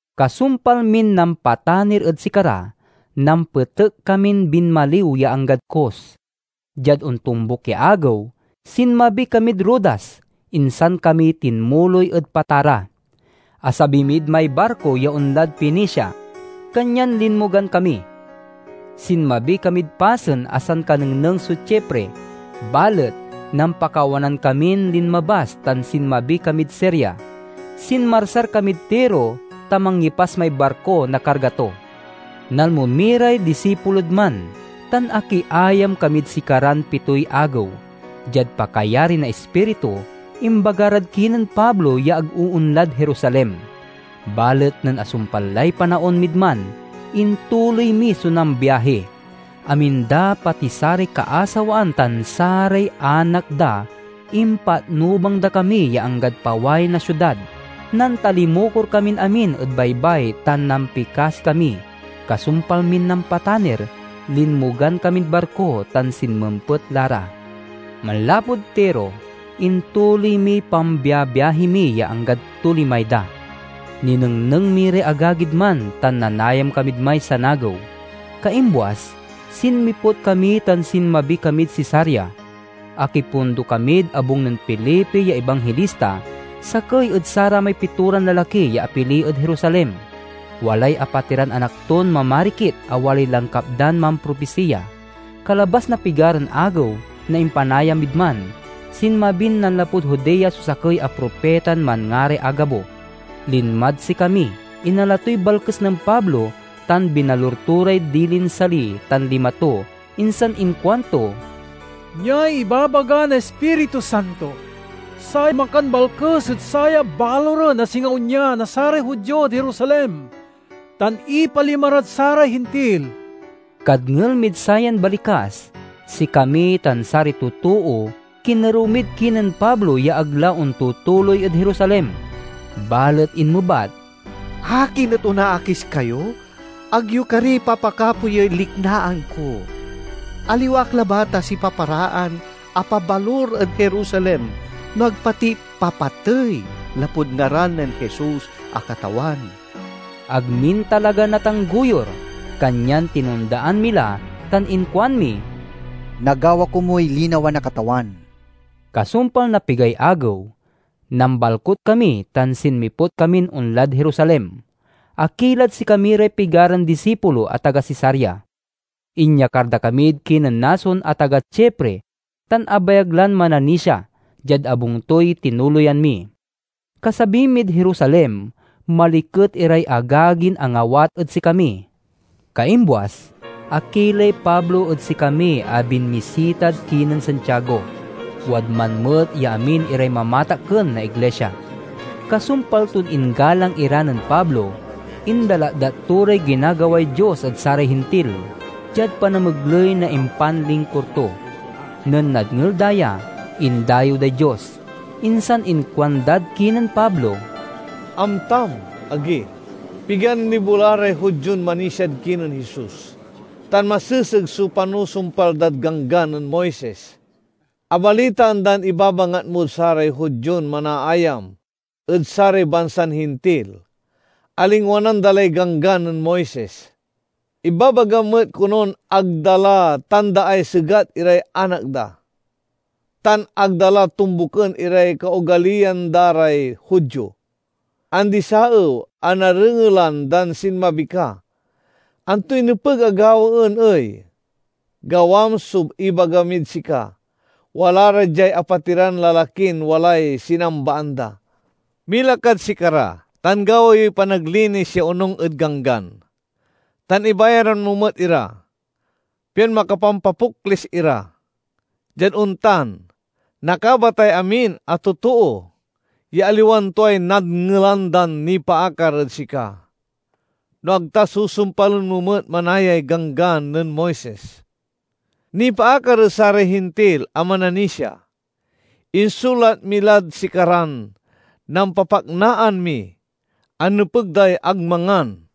Kasumpal min nampatanir ed sikara, nampetek kamin binmaliw ya anggad Cos. Diad ontombuk ya agew, sinmabi kamid Rodas, insan kami tinmuloy ed Patara. Asabi mid may barko ya onlad Fenicia, kanyan linmogan kami. Sinmabi kamid pasen a sankanengneng so Chipre, balet nampakawanan kamin linmabas tan sinmabi kamid Siria. Sinmarsar kamid Tiro, ta mangyepas may barko na karga to. Nalmo mi ray disipulod man, tan akiayam kamid sikaran pitoy agew. Diad pakayari na Ispiritu, imbaga rad kinen Pablo ya ag oonlad Jerusalem. Balet nen asumpal lay panaon mid man, intuloy mi so nambiahi. Amin da, pati saray kaasawaan tan saray anak da, impatnubang da kami ya anggad paway na siudad. Nantalimukor kamin amin ed baybay tan nampikasi kami. Kasumpal min nampatanir, linmogan kamid barko tan sinmempet la ra. Manlapud Tiro, intuloy miy pambiabiahi mi ya anggad Tolemaida. Ninengneng mi ray agagid man tan nanayam kamid may sanagew. Kaimbuas, sinmiput kami tan sinmabi kamid Cesarea. Akipundo kamid abung nen Felipe ya ibanghilista, sakey ed saramay pitoran lalaki ya apili ed Jerusalem. Walay apatiran anak ton mamarikit a walay langkap dan mampropisiya. Kalabas na pigaran agew na impanayam mid man, sinmabin nanlapud Judea so sakey a propitan manngaray Agabo. Linmad sikami, inala toy balkes nen Pablo, tan binalur to ray dilin sali tan lima to, insan inkuanto, "Niay ibabaga na Ispiritu Santo: Say makanbalkes ed saya baluren a singa onya na saray Judio ed Jerusalem, tan ipalima rad saray Hintil." Kadngel mid sayan balikas, sikami tan saray totoo kinerew mid kinen Pablo ya ag la ontutuloy ed Jerusalem. Balet inmebat, "Akin et onaakis kayo? Ag yo kari papakapoyey liknaan ko! Aliwa ak labat a sipaparaan a pabalur ed Jerusalem no ag pati papatey lapud ngaran nen Jesus a Katawan." Ag min talaga natanggoyur, kanyan tinondaan mi la tan inkuan mi, "Nagawa komuy linawa na Katawan." Kasumpal na pigay agew, nambalkut kami tan sinmiput kamin onlad Jerusalem. Akilad sikami ray pigaran disipulo a taga Cesarea. Inyakar da kamid kinen Mnason a taga Chipre tan abayag lan mananisia; diad abung toy tinuloyan mi. Kasabi mid Jerusalem maliket iray agagin angawat ed sikami. Kaimbuas, akilay Pablo ed sikami a binmisitad kinen Santiago. Wadman met ya amin iray mamatakken na iglisia. Kasumpal ton inggalang ira nen Pablo, indalatdat to ray ginagaway Dios ed saray Hintil diad panamegley na impanlingkur to. Nen nadngel da ya, indayew day Dios. Insan inkuandad kinen Pablo, "Amtam, agi, pigan libo la ray Judion manisiad kinen Jesus, tan maseseg so panusumpal dad Ganggan nen Moises. Abalitaan dan ibabangat mod saray Judion manaayam ed saray bansan Hintil a lingwanan da lay Ganggan nen Moises. Ibabagam met konon ag da la tandaay segat iray anak da, tan ag da la tombuken iray kaogaliyan da ray Judio. Andi-saew a narengelan dan sinmabi ka. Antoy nepeg a gawaen ey? Gawam so ibaga mid sika. Wala ra diay apatiran lalakin walay sinambaan da. Mila kad sikara tan gawa yoy panaglinis ya onung ed Ganggan, tan ibayaran mo met ira, pian makapampapoklis ira. Diad ontan, nakabatay amin a totoo ya aliwan tuay nadngelan dan nipaakar ed sika, no ag ta susumpalen mo met manayay Ganggan nen Moises. Nipaakar ed saray Hintil a mananisia, insulat mi lad sikaran nampapaknaan mi a nepeg day ag mangan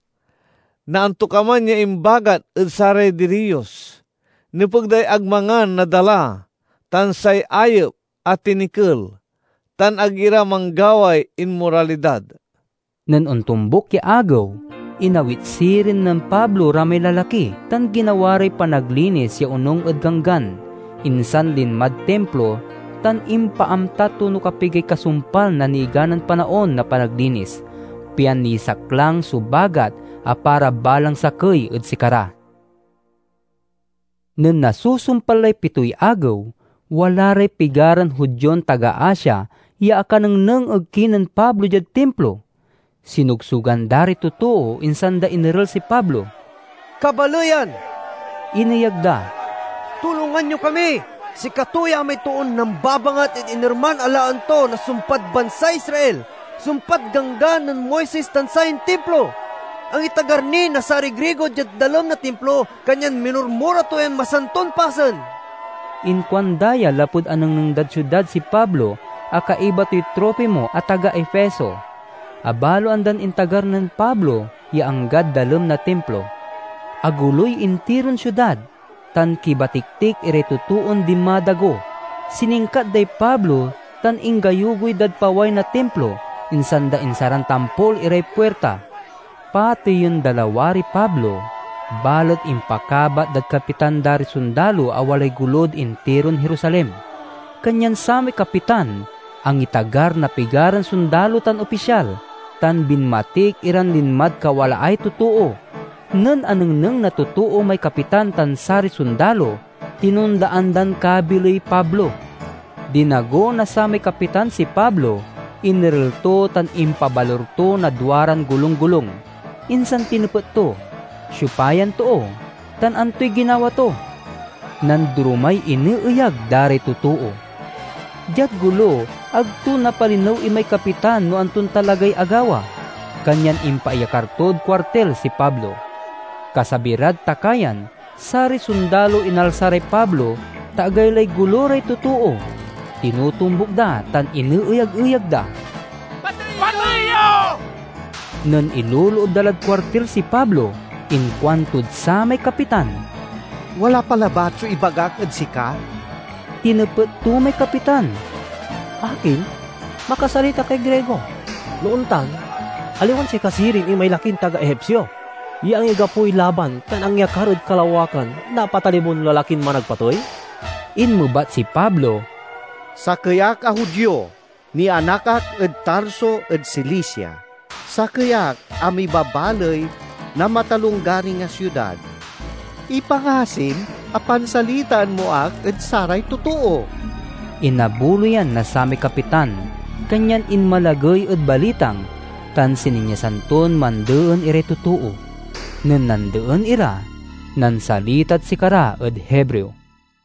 na antokaman ya imbagat ed saray diriyos, nepeg day ag mangan na dala tan say ayep a tinikel, tan ag ira manggaway inmoralidad." Nen ontombuk ya agew, inawit sirin nen Pablo ra may lalaki tan ginawa ray panaglinis ya onung ed Ganggan. Insan linmad Timplo tan impaamta to no kapigay kasumpal na niganan panaon na panaglinis, pian nisaklang so bagat a para balang sakey ed sikara. Nen nasusumpal lay pitoy agew, wala ray pigaran Judion taga Asia ya akanengneng ed kinen Pablo diad Timplo. Sinogsogan da ray totoo, insan da inerel si Pablo. "Kabaleyan," ineyag da, "tulongan yo kami! Sikato ya may toon nambabangat ed inerman a laen to na sumpad bansay Israel, sumpad Ganggan nen Moises tan sayan Timplo. Angitagar ni na saray Grigo diad dalem na Timplo, kanyan minurmura to yan masanton pasen!" (Inkuanda ya lapud anengneng dad siudad si Pablo a kaiba toy Trofimo a taga Efeso. Abaloan dan intagar nen Pablo ya, anggad dalem na Timplo.) Agoloy intiron siudad, tan kibatiktik iray totoon dinmadago. Siningkat day Pablo, tan inggayugoy dad paway na Timplo, insan da insaran tampol iray puirta. Pateyen da lawariy Pablo, balet impakabat dad kapitan da ray sondalo a walay golod intiron Jerusalem. Kanyan samay kapitan angitagar na pigaran sondalo tan opisyal, tan binmatik iran linmad kawalaay totoo. Nen anengneng na totoo may kapitan tan saray sondalo, tinondaan dan kabiley Pablo. Dinago na samay kapitan si Pablo, inerel to tan impabalur to na duaran golunggolung. Insan tinepet to, "Siopa yan too, tan antoy ginawa to?" Nandoromay ineeyag da ray totoo. Diad golo, ag to napalinew imay kapitan no anton talagay agawa, kanyan impaiyakar tod kuartil si Pablo. Kasabi rad takayan saray sondalo inalsa ray Pablo, ta agaylay golo ray totoo. Tinotombuk da, tan ineyag-eyag da, "Patey yo!" Nen iloloob da lad kuartil si Pablo, inkuantod samay kapitan, "Wala pa labat so ibagak ed sika." Tinepet to may kapitan, "Akin, makasalita kay Grigo? No ontan, aliwan sika sirin imay lakin taga Egipsio ya angigapoy laban tan angyakar ed kalawakan na apat a libon lalakin managpatey?" Inmebat si Pablo, "Sakey ak a Judio, nianak ak ed Tarso ed Cilicia. Sakey ak a mibabaley na matalonggaring a siudad. Ipangasim a pansalitaen mo ak ed saray totoo." Inabuloyan na samay kapitan, kanyan inmalagey ed balitang, tan sininyasan ton mandeen iray totoo. Nen nandeen ira, nansalitad sikara ed Hebreo: